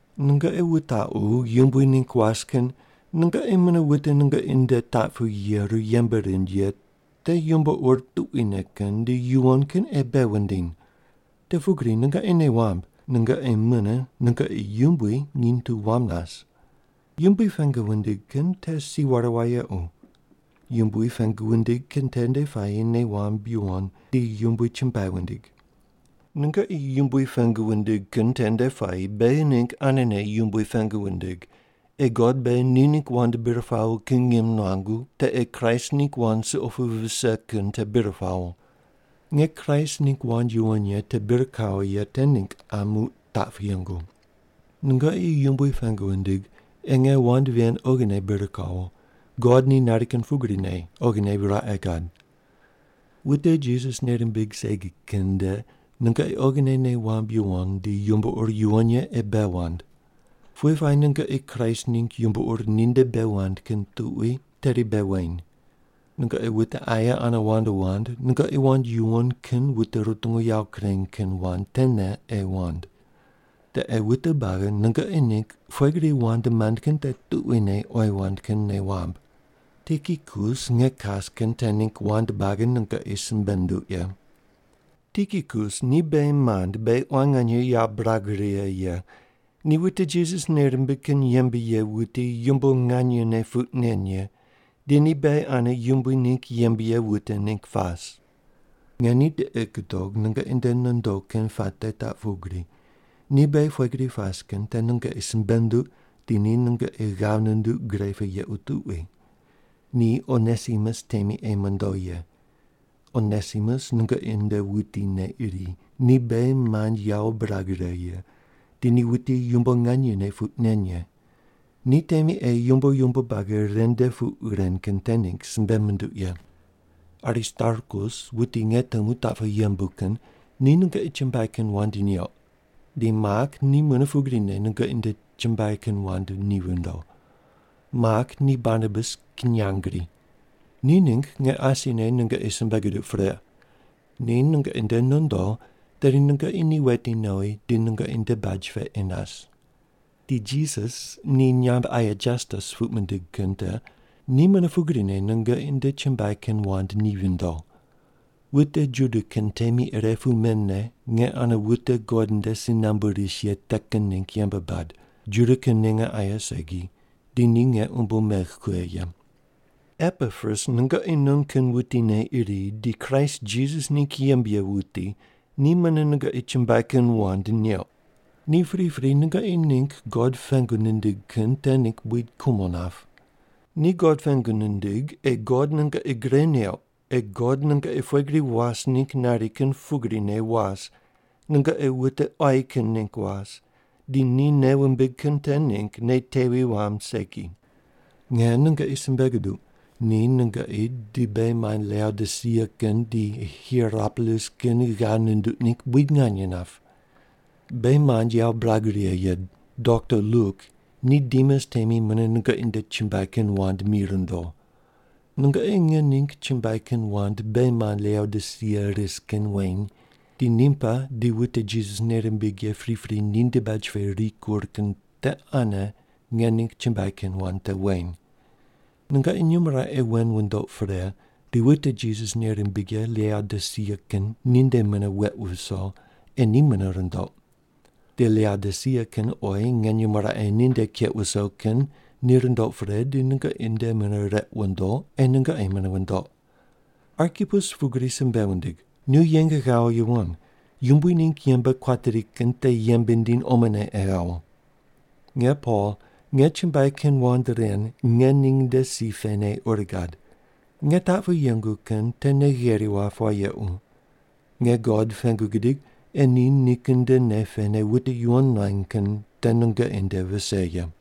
Nungoqi wutaqu yumbui ningg was kin nungoqi mune wute nungoqi nde taq pu yeru yembe rind ye te yumbo ur tuquine kin di yuwon kin ei bei wundiny. Te pugri nungoqi nei wamb nungoqi mune nungoqi Yumbui nginy tu wam nas. Yumbui pengu wundig kin te si ware wayequ. Yumbui pengu wundig kin tende puayi nei wamb yuwon di Yumbui chumbuai wundig. Nungoqi Yumbui pengu wundig kin tende puayi beghi ningg anene Yumbui pengu wundig ei God beghi ni ningg wand bir pawo kin ngim nuangu, te ei Kraist ningg wand suqo pu vise kin te bir pawo. Nge Kraist ningg wand yuwon ye te bir kawo ye te ningg qa muq taq pu yengu. Nungoqi Yumbui pengu wundig ei nge wand ven oghine bir kawo, God ni nari kin pugrine oghine raqe gad. Wute Jisas nei rimbig segi kin nde nungoqi oghine nei wamb yuwon di yumbo ur yuwon ye ei bei wand. Pughe puayi nungoqi Kraist ningg yumbo ur ninde bei wand kin tuqui tedi bei weny. Nungoqi wute aye ane wand wand nungoqi wand yuwon kin wute rutungu yawo kureny kin wand tene ei wand. Te ei wute buagi nungoqi ningg pughe gri wand mand kin te tuquine oyi wand kin nei wamb. Tikikus nge kas kin te ningg wand buagi nungoqi simbe nunduq ye. Tikikus ni beghi mand beghi quan nganye yawo birag righe ye, ni wute Jisas nei rimbig kin yembe ye wuti yumbo nganyene puq nen ye, di ni beghi ane Yumbui ningg yembe ye wute ningg pas. Nge ni tiqi gudog nungoqi nde nondo kin puate taq pugri, ni beghi pughe gri pas kin te nungoqi simbe nunduq di ni nungoqi ghav nunduq gre pu yequ tuqui. Ni Onesimus temi ei mondo ye. Onesimus nungoqi non wutine iri, ni beghi mand yawo birag righe ye, di ni wuti yumbo nganyene puq nen ye. Ni temi ei yumbo yumbo buagi ren nde puq ren kin te ningg simbe munduq ye. Aristarkus wuti nge temu taq pu yembu kin ni nungoqi chumbuai kin wand neuq, di Mak ni mune pugrine nungoqi nde chumbuai kin wand ni vindo. Mak ni Barnabas kinyangri. Ni ningg nge asine nungoqi simbe guduq pre, ni nungoqi nde nondo tedi nungoqi ni weti nowi di nungoqi nde baj pe ei nas. Di Jisas ni nyamb aye Jastus puq mindig kin te ni mune pugrine nungoqi nde chumbuai kin wand ni vindo. Wute Juda kin temi ire pu men ne nge ane wute God nde si nambu ris ye te kin ningg yembe bad, Juda kin ninge aye segi, di ni nge umbo megh kughe ye. Epapras nungoqi non kin wutine iri, di Kraist Jisas ningg yembe ye wuti, ni mune nungoqi chumbuai kin wand neuq. Ni pripri nungoqi ningg God pengu nindig kin te ningg buid kumo nap. Ni God pengu nindig ei God nungoqi gre neuq ei God nungoqi pughe gri was ningg nari kin pugrine was, nungoqi wute quayi kin ningg was, di ni nei wumbig kin te ningg nei tevi wamb segi. Nge nungoqi simbe guduq ni nungoqi di beghi mand Laodisia kin di Hierapolis kin ghav nunduq ningg buid nganye nap. Beghi mand yawo birag righe ye dokta Luk ni Demas temi mune nungoqi nde chumbuai kin wand mi rundo. Nungoqi nge ningg chumbuai kin wand beghi mand Laodisia ris kin weny, di Nimpa di wute Jisas nei rimbig ye pripri ninde baj pe rikur kin te ane nge ningg chumbuai kin wand te weny. Nungoqi nyumo raqe wen wundoq pre di wute Jisas nei rimbig ye Laodisia kin ninde mune weq wuso ei ni mune rundoq. Di Laodisia kin oyi nge nyumo raqe ninde keq wuso kin ni rundoq pre di nungoqi nde mune req wundo ei nungoqi mune wundoq. Arkipus pugri simbe wundig, “Nu yeng ghawo yuwon Yumbui ningg yembe kuateri kin te yembe ndiny omone ei ghawo.” Nge Pol, nge chumbuai kin wand ren nge ning nde si pene ur gad. Nge taq pu yengu kin te nei gheri wap wayequ. Nge God pengu gidig ei ni nikin nde nei pene wute yuwon nuany kin te nungoqi nde vise ye.